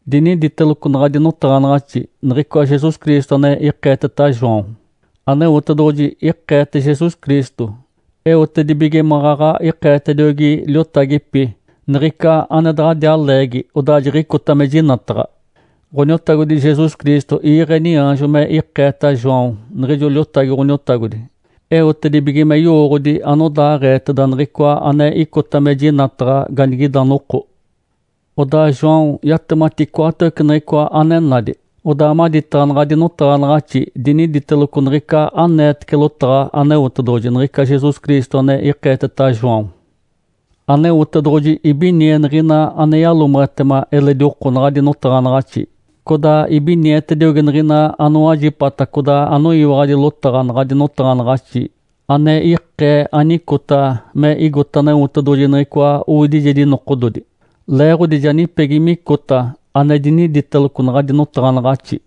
Diniditeloco naɡ̶adi notaɡ̶anaɡ̶axi niɡ̶icoa Jesus Cristo ane ikeeteta João. Aneotedoɡ̶oji ikeete Jesus Cristo, eotedibige maɡ̶aɡ̶a ikeetediogi liotagipi niɡ̶ica ane daɡ̶adiaa leegi odaa jiɡ̶icota me jinataɡ̶a. Ǥoniotagodi Jesus Cristo iiɡ̶e niaanjo me ikeeta João niɡ̶ijo liotagi Ǥoniotagodi, eotedibige me yowooɡ̶odi anodaaɡ̶eeteda niɡ̶icoa ane icota me jinataɡ̶a ganigida noko. Odaa João yatemati icoatawece niɡ̶icoa ane nadi. Odaa maditaɡ̶a naɡ̶adi notaɡ̶anaɡ̶axi diniditeloco niɡ̶ica aneetece lotaɡ̶a Aneotedoɡ̶oji, niɡ̶ica Jesus Cristo ane ikeeteta João. Aneotedoɡ̶oji ibinie niɡ̶ina ane yalomeɡ̶etema eledi oko naɡ̶adi notaɡ̶anaɡ̶axi, codaa ibinietediogi niɡ̶ina anowajipata codaa anoyiwaɡ̶adi lotaɡ̶a naɡ̶adi notaɡ̶anaɡ̶axi ane ikee anicota me igote Aneotedoɡ̶oji niɡ̶icoa owidijedi nokododi. Leeɡ̶odi ja nipegi micota ane diniditeloco naɡ̶adi notaɡ̶anaɡ̶axi.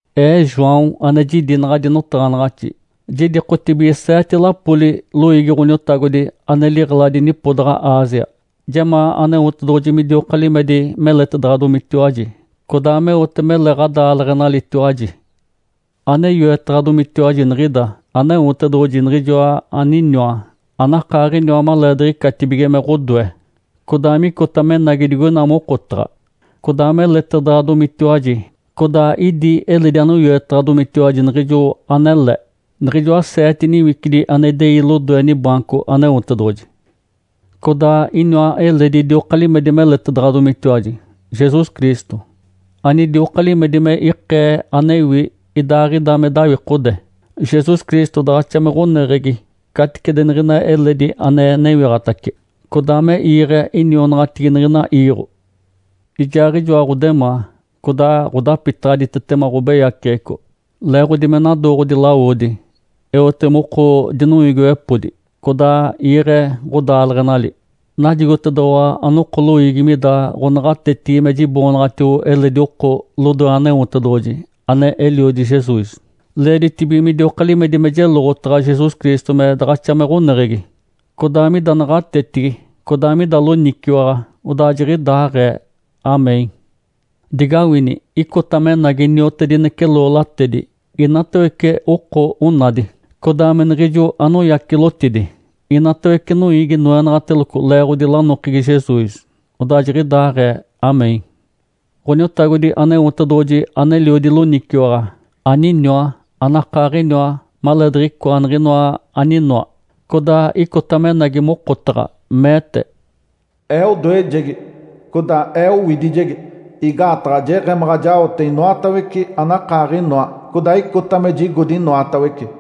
Ee João ane jidi naɡ̶adi notaɡ̶anaɡ̶axi, jidikotibige seete lapoli loiigi Ǥoniotagodi ane liɡ̶eladi nipodaɡ̶a Ásia. Jemaa Aneotedoɡ̶oji midioka limedi meletedaɡ̶adomitiwaji, codaa meote mele ɡ̶adaaleɡ̶enalitiwaji. Ane yoetaɡ̶adomitiwaji niɡ̶ida, Aneotedoɡ̶oji, Niɡ̶ijoa aniniwa, anakaaɡ̶iniwa maleediɡ̶icatibige me ɡ̶odoe, codaa micota menagi digoina mokotaɡ̶a, codaa meletedaɡ̶adomitiwaji, codaa idi eledi anoyoetaɡ̶adomitiwaji niɡ̶ijo anele, niɡ̶ijoa seete niwicidi ane idei lodoe nibaanco Aneotedoɡ̶oji. Codaa iniwa eledi idioka limedi meletedaɡ̶adomitiwaji, Jesus Cristo, anidioka limedi me ikee anewi idaaɡ̶ida me dawikode. Jesus Cristo daɡ̶axa me ɡ̶oneɡ̶egi caticedi niɡ̶ina eledi ane newiɡ̶atace, codaa me iiɡ̶e inionaɡ̶atigi niɡ̶ina iiɡ̶o. Ijaaɡ̶ijoa ɡ̶odemaa, codaa ɡ̶odapitaɡ̶aditetema ɡ̶obeyaceɡ̶eco leeɡ̶odi me nadooɡ̶odi lawodi. Eote moko dinoiigiwepodi codaa iiɡ̶e ɡ̶odaaleɡ̶enali. Najigotedoɡ̶owa, anoko loiigi, mida ɡ̶onaɡ̶atetigi me jiboonaɡ̶atio eledi oko lodoe Aneotedoɡ̶oji, ane Eliodi Jesus. Leeditibige midioka limedi me jeloɡ̶otaɡ̶a Jesus Cristo me daɡ̶axa me ɡ̶oneɡ̶egi, codaa mida naɡ̶atetigi codaa mida loniciwaɡ̶a. Odaa jiɡ̶idaaɡ̶ee. Amém. Digawini! Icota menagi niotedinece loolatedi. Inatawece oko onadi, codaa me niɡ̶ijo anoyacilotidi. Inatawece noiigi noenaɡ̶ateloco leeɡ̶odi lanokegi Jesus. Odaa jiɡ̶idaaɡ̶ee. Amém. Ǥoniotagodi Aneotedoɡ̶oji aneliodi loniciwaɡ̶a, aniniwa, ane akaaɡ̶iniwa maleediɡ̶icoa niɡ̶inoa aninoa, codaa icota menagi mokotaɡ̶a, meete, “Ee odoejegi codaa Ee mowidijegi, igaataɡ̶a jeɡ̶emaɡ̶a jaote inoatawece anakaaɡ̶inoa, codaa icota me jigodi inoatawece.”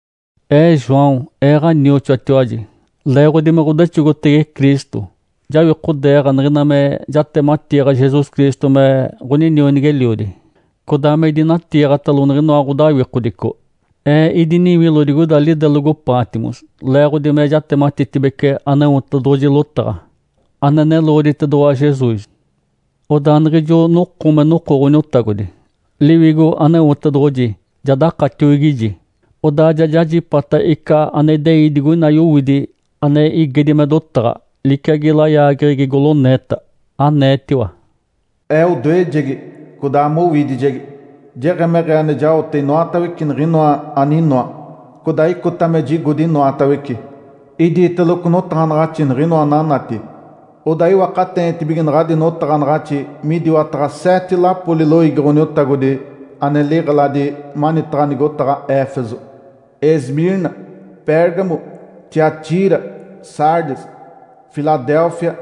Ee João, ee ɡ̶anioxoatiwaji. Leeɡ̶odi me ɡ̶odexogotege Cristo, jawikodeeɡ̶a niɡ̶ina me jatematiiɡ̶a Jesus Cristo me ɡ̶oninionigi-eliodi. Codaa me idinatiiɡ̶atalo niɡ̶inoa ɡ̶odawikodico. Ee idiniwilo digoida lidelogo Patmos leeɡ̶odi me jatematitibece Aneotedoɡ̶oji lotaɡ̶a, ane neloɡ̶oditedoɡ̶owa Jesus. Odaa niɡ̶ijo noko me noko Ǥoniotagodi, Liwigo Aneotedoɡ̶oji ja dakatiwigiji. Odaa ja jajipata ica ane idei digoina yowidi ane igedi me dotaɡ̶a liciagi layaageɡ̶egi goloneeta. Aneetiwa, “Ee odoejegi codaa mowidijegi. Jeɡ̶emeɡ̶ee ane jaote inoatawece niɡ̶inoa aninoa, codaa icota me jigodi inoatawece. Idiiteloco notaɡ̶anaɡ̶axi niɡ̶inoa ananati, odaa iwakateenitibige naɡ̶adi notaɡ̶anaɡ̶axi midiwataɡ̶a seete lapoli loiigi Ǥoniotagodi ane liɡ̶eladi manitaɡ̶a nigotaɡ̶a Éfeso, Esmirna, Pérgamo, Tiatira, Sardes, Filadélfia,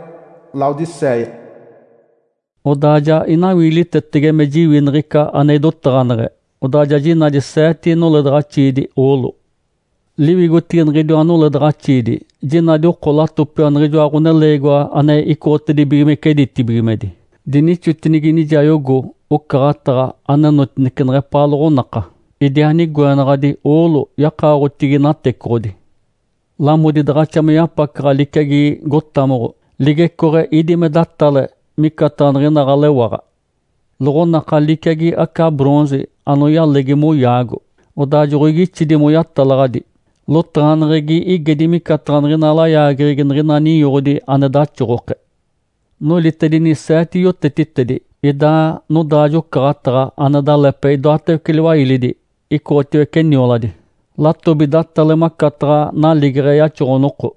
Laodicéia.” Odaa ja inawiilitetege me jiwi niɡ̶ica ane idotaɡ̶aneɡ̶e, odaa ja jinadi seete noledaɡ̶axiidi oolo. Liwigotigi niɡ̶idiwa noledaɡ̶axiidi jinadi oko latopiwa niɡ̶ijoa Ǥoneleegiwa ane icoɡ̶otibigimece ditibigimedi. Dinixotinigi nijayogo ocaɡ̶ataɡ̶a anenotinece neɡ̶epaa loɡ̶onaka, idiaa nigoenaɡ̶adi oolo yakaoɡ̶otigi natecoɡ̶odi. Lamodi daɡ̶axa me yapacaɡ̶a liciagi gotamoɡ̶o. Ligecooɡ̶e ídi me datale micataɡ̶a niɡ̶ina ɡ̶alewaɡ̶a. Loɡ̶onaka liciagi aca “bronze” anoyalegi moyaago, odaa joɡ̶oigixidi moyatalaɡ̶adi. Lotaɡ̶aneɡ̶egi igedi micataɡ̶a niɡ̶ina layaageɡ̶egi niɡ̶ina ninyoɡ̶odi ane daxoɡ̶oke. Nolitedini seete yotetitedi. Idaa nodaajo-ocaɡ̶ataɡ̶a ane dalepe idoatawece liwailidi icoɡ̶otiwece nioladi. Latobi datale macataɡ̶a naligeɡ̶e yaxoɡ̶o-noko.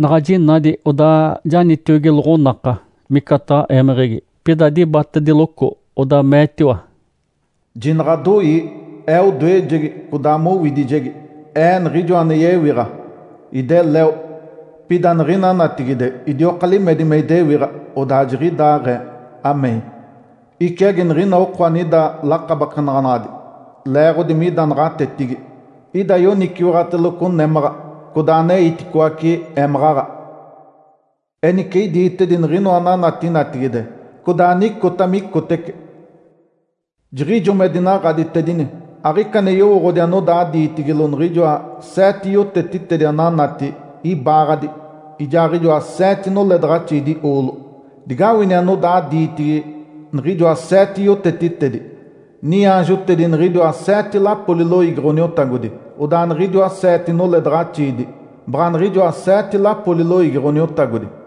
Naɡ̶a jinadi, odaa janitiogi loɡ̶onaka micataɡ̶a émeɡ̶egi. Pida dibatediloco, odaa meetiwa, “Jinaɡ̶adoii! Ee odoejegi codaa mowidijegi. Ee Niɡ̶ijoa ane yewiɡ̶a. Ideleo, pida niɡ̶ina natigide idioka limedi me idewiɡ̶a. Odaa jiɡ̶idaaɡ̶ee. (Amém.) Iciagi niɡ̶ina oko anida lakabakenaɡ̶anaɡ̶adi leeɡ̶odi mida naɡ̶atetigi, ida yoniciwaɡ̶ateloco némaɡ̶a codaa aneiticoace émaɡ̶aɡ̶a. Enice idiitedi niɡ̶inoa ananati natigide, codaa anicota micotece. Jiɡ̶ijo me dinaɡ̶aditedini, aɡ̶ica ane yowooɡ̶odi anodaa diitigilo niɡ̶ijoa seete yotetitedi ananati ibaaɡ̶adi ijaaɡ̶ijoa seete noledaɡ̶axiidi oolo. Digawini anodaa diitigi niɡ̶ijoa seete yotetitedi, niaanjotedi niɡ̶idiwa seete lapoli loiigi Ǥoniotagodi, odaa niɡ̶idiwa seete noledaɡ̶axiidi, baɡ̶a niɡ̶ijoa seete lapoli loiigi Ǥoniotagodi.”